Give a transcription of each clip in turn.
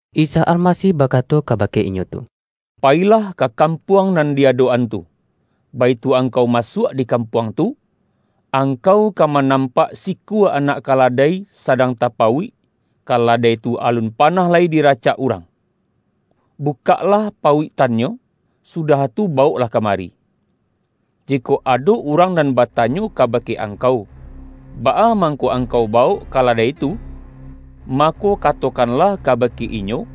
Isa Almasih ba-kato kabake inyo tu,”Payilah ka kam-puang nan di adok-an tu. Baitu ang-kau masuak di kampuang tu, angkau ka manampak sikua anak kaladai sa-dang tapauik, kaladai tu alun panah lai diracak urang. Bukaklah pauiktan-nyo, sudah tu bawoklah kamari. Jikok ado urang nan batanyo kabake angkau, baa mangko angkau bawok kaladai tu, mako, katokanlah kabake inyo,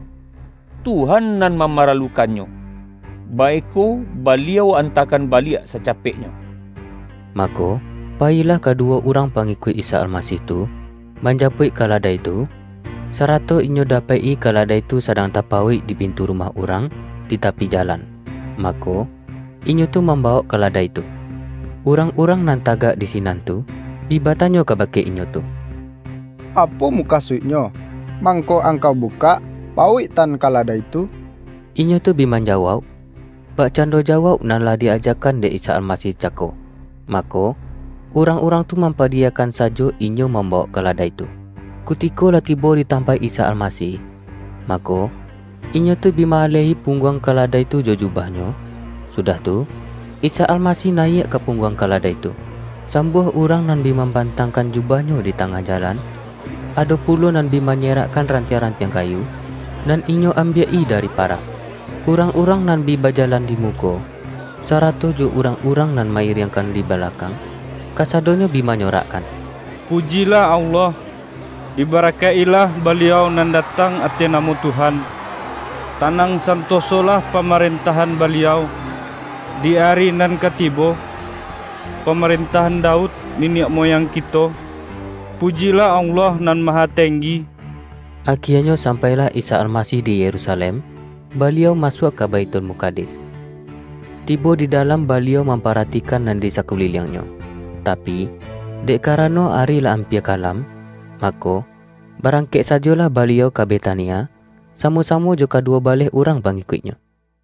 ’Tuhan nan mamaralukannyo, baiko Baliau an-takan baliak sacapeknyo.’” Mako, payilah kaduwo urang pa-ngikuik Isa Almasih tu, manjapuik ka-ladai tu, sarato inyo dapek-i kaladai tu sadang tapauik di pintu rumah urang, di tapi jalan. Mako, inyo tu mambawok kaladai tu. Urang-urang nan tagak di sinan tu, bi batanyo kabake inyo tu,”Apo mukasuiknyo, mangko angkau bukak pauiktan kaladai tu?” Inyo tu bi manjawauk, bakcando ja-wauk nan lah di-ajakan dek Isa Almasih cako. Mako, urang-urang tu mampadi-yakan sajo inyo mambawok kaladai tu. Kutiko lah tibo di tampaik Isa Almasih, mako, inyo tu bi ma-alehi pungguang kaladai tu jo jubahnyo, sudah tu, Isa Almasih nayiak ka pungguang kaladai tu. Sambuah urang nan bi mamban-tangkan jubahnyo di tangah jalan, ado pulo nan bi manyerakkan rantiang-rantiang kayu, nan inyo ambiak-i dari parak. Urang-urang nan bi bajalan di muko, sarato jo urang-urang nan ma-iriangkan di balakang, kasadonyo bi manyorakkan,”Pujilah Allah! Dibara-kaik-ilah Baliau nan datang ateh namo Tuhan! Tanang santosolah pamaren-tahan Baliau di ari nan ka tibo--- pa-marentahan Daud niniak muyang kito! Pujilah Allah Nan Mahatenggi!” Akienyo sampailah Isa Almasih di Yerusalem, Baliau masuak ka Baithul-mukadis. Tibo di dalam Baliau mam-paratikan nan di sakuliliang-Nyo. Ta-pi, dek karano ari lah ampia kalam, mako, barangkek sajolah Baliau ka Betania, samo-samo jo kaduwo baleh urang pangikuik-Nyo.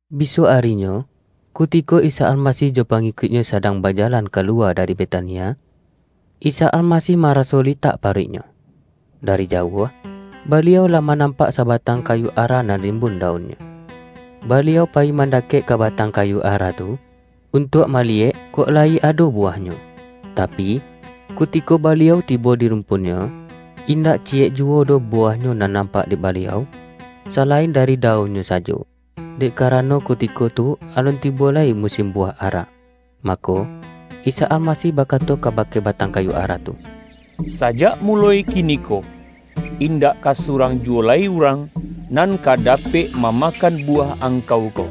Bisuak arinyo, kutiko Isa Almasih jo pangikuik-Nyo sadang bajalan kalu-wa dari Betania, Isa Almasih maraso li-tak paruik-Nyo. Dari jauah, Baliau lah manampak sabatang kayu ara nan rim-bun daunnyo. Baliau payi mandakek ka batang kayu ara tu, untuak maliyek kok layi ado buwahnyo. Tapi, kutiko Baliau tibo di rumpunnyo, indak ciyek juwo doh buwahnyo nan nampak dek Baliau, salain dari daunnyo sajo, dek karano ku-tiko tu alun tibo lai musin buwah ara. Mako, Isa Almasih bakato kabake ba-tang kayu ara tu,”Sajak muloi kiniko, indak ka surang juwo lai urang, nan ka dapek mamakan buwah angkau ko!”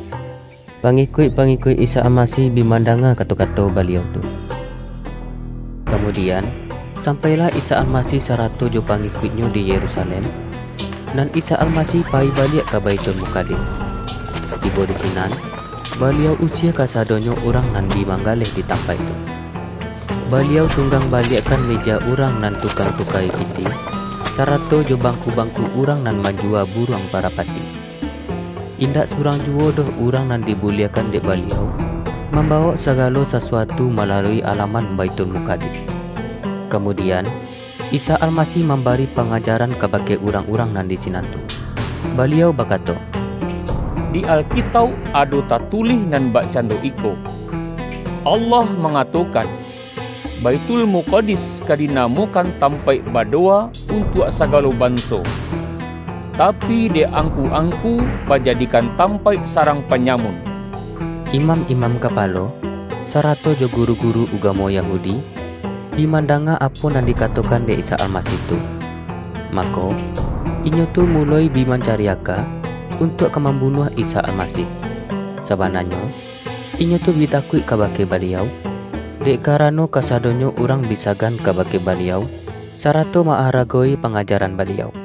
Pangikuik-pangikuik Isa Almasih bi mandanga kato-kato Baliau tu. Kamudian, sampailah Isa Almasih sarato jo pangikuik-Nyo di Yerusalem, nan Isa Almasih payi baliak ka Baithul-mukadis. Tibo di sinan, Baliau usie ka-sadonyo urang nan bi manggaleh di tampaik tu. Baliau tunggang baliakkan meja urang nan tukang tuka-i pitih, sa-rato jo bangku-bangku urang nan man-juwa buruang parapati. Indak surang juwo doh urang nan dibuliahkan dek Baliau, mambawok sagalo sasuatu ma-lalui alaman Baithulmukadis. Kamu-dian, Isa Almasih mambari pangajaran kabake urang-urang nan di sinan tu. Baliau bakato,”Di Alkitauk ado tatu-lih nan bakcando iko: Allah mangato-kan, ’Baithulmukadis ka dinamokan tampaik badowa untuak sagalo ban-so.’ Tapi, dek angku-angku bajadikan tampaik sarang panyamun!” Imam-imam kapalo, sarato jo gu-ru-guru ugamo Yahudi, bi mandanga apo nan dikatokan dek Isa Almasih tu. Mako, inyo tu muloi bi mancari aka, untuak ka mambunuah Isa Almasih. Sabananyo, inyo tu bi takuik kabake Baliau, dek karano kasadonyo urang bi sagan kabake Baliau, sarato ma-aragowi pangajaran Baliau.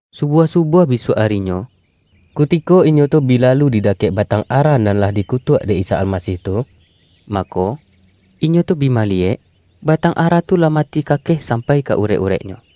Subuah-subuah bisuak arinyo, ku-tiko inyo tu bi lalu di dakek batang ara, nan lah dikutuak dek Isa Almasih tu, mako, inyo tu bi maliyek, batang ara tu lah mati kakeh sampai ka urek-ureknyo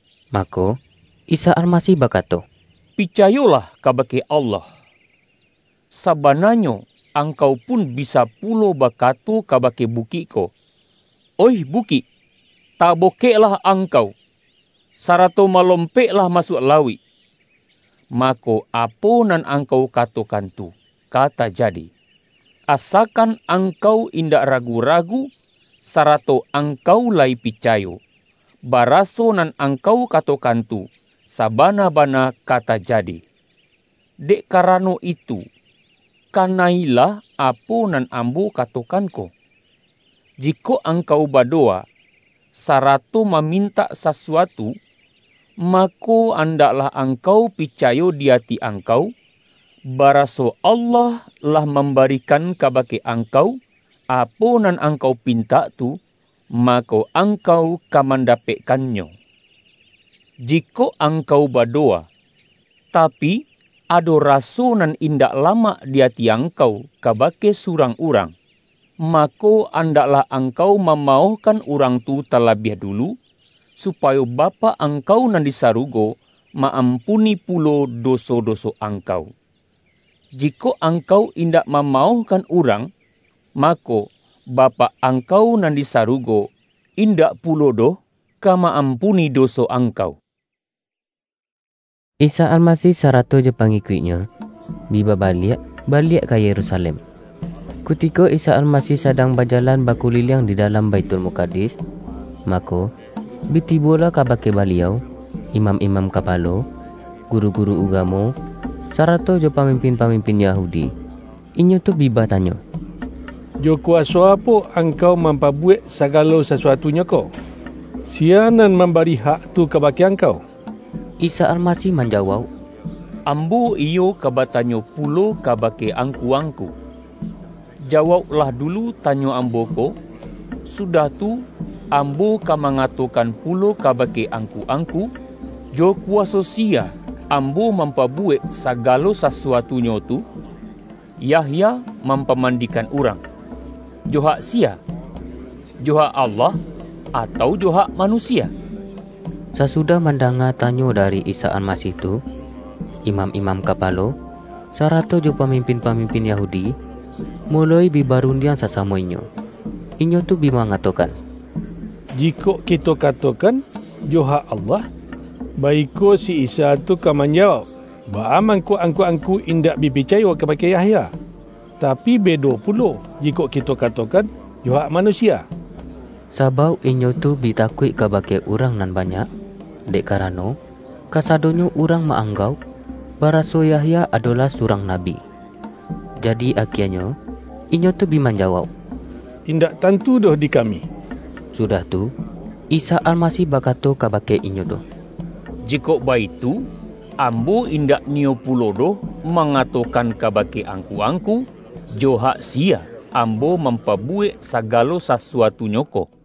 Mako, Isa Almasih bakato,”Picayo-lah kabake Allah. Sabananyo, angkau pun bisa pulo bakato kabake bukik ko, ’Oih bukik, tabokeklah angkau, sarato malompeklah masuak lauik!’ mako, apo nan angkau katokan tu, ka tajadi; asakan angkau indak ragu-ragu, sarato angkau layi picayo, baraso nan angkau katokan tu, sabana-bana ka tajadi. Dek karano itu, kana-ilah apo nan Ambo katokan ko: Jikok angkau badowa, sarato mamintak sasuatu, mako, andaklah angkau picayo di ati angkau, baraso Allah lah mambari-kan kabake angkau, apo nan angkau pin-tak tu, mako, angkau ka mandapekkan-nyo. Jikok angkau badowa, tapi, ado raso nan indak lamak di ati angkau ka-bake surang urang, mako, andaklah ang-kau mamaohkan urang tu talabiah dulu, supayo Bapak angkau nan di sarugo, ma-ampuni pulo doso-doso angkau. [ Jikok angkau indak mamaohkan urang, mako, Bapak angkau nan di sarugo, indak pulo doh ka ma-ampuni doso angkau.]" Isa Almasih sarato jo pangikuik-Nyo, bi babaliak baliak ka Yerusalem. Kutiko Isa Almasih sadang bajalan ba-kuliliang di dalam Baithulmukadis, mako, bi tibolah kabake Baliau, imam-imam kapalo, guru-guru ugamo, sa-rato jo pamimpin-pamimpin Yahudi. Inyo tu bi batanyo,”Jo kuwaso apo Angkau mampabuwek sagalo sasuatu-nyo ko? Siya nan mambari hak tu ka-bake Angkau?” Isa Almasih manjawauk,”Ambo iyo ka batanyo pulo kabake angku-angku. Jawauklah dulu tanyo Ambo ko, sudah tu, Ambo ka mangatokan pulo kabake angku-angku, jo kuwaso siya Ambo mampabuwek sagalo sasu-atunyo tu. Yahya mampamandikan urang, jo hak siya, jo hak Allah, atau jo hak manusia?” Sasudah mandanga tanyo dari Isa Almasih tu, imam-imam kapalo, sarato jo pamimpin-pamimpin Yahudi, muloi bi barundiang sasamo inyo. Inyo tu bi mangatokan,”Jikok kito katokan, ’Jo hak Allah.’ baiko si Isa tu ka manja-wauk, ’Baa mangko angku-angku in-dak bi picayo kabake Yahya?' Tapi bedo pulo, jikok kito katokan, ’Jo hak manusia.’” Sabauk inyo tu bi takuik kabake urang nan banyak, dek kara-no, kasadonyo urang ma-anggauk, ba-raso Yahya adolah surang nabi. Jadi akienyo, inyo tu bi manjawauk,”In-dak tantu doh di kami.” Sudah tu, Isa Almasih bakato kabake inyo tu,”Jikok baitu, Ambo indak ni-yo pulo doh mangatokan kabake ang-ku-angku, jo hak siya Ambo mampa-buwek sagalo sasuatunyo ko.”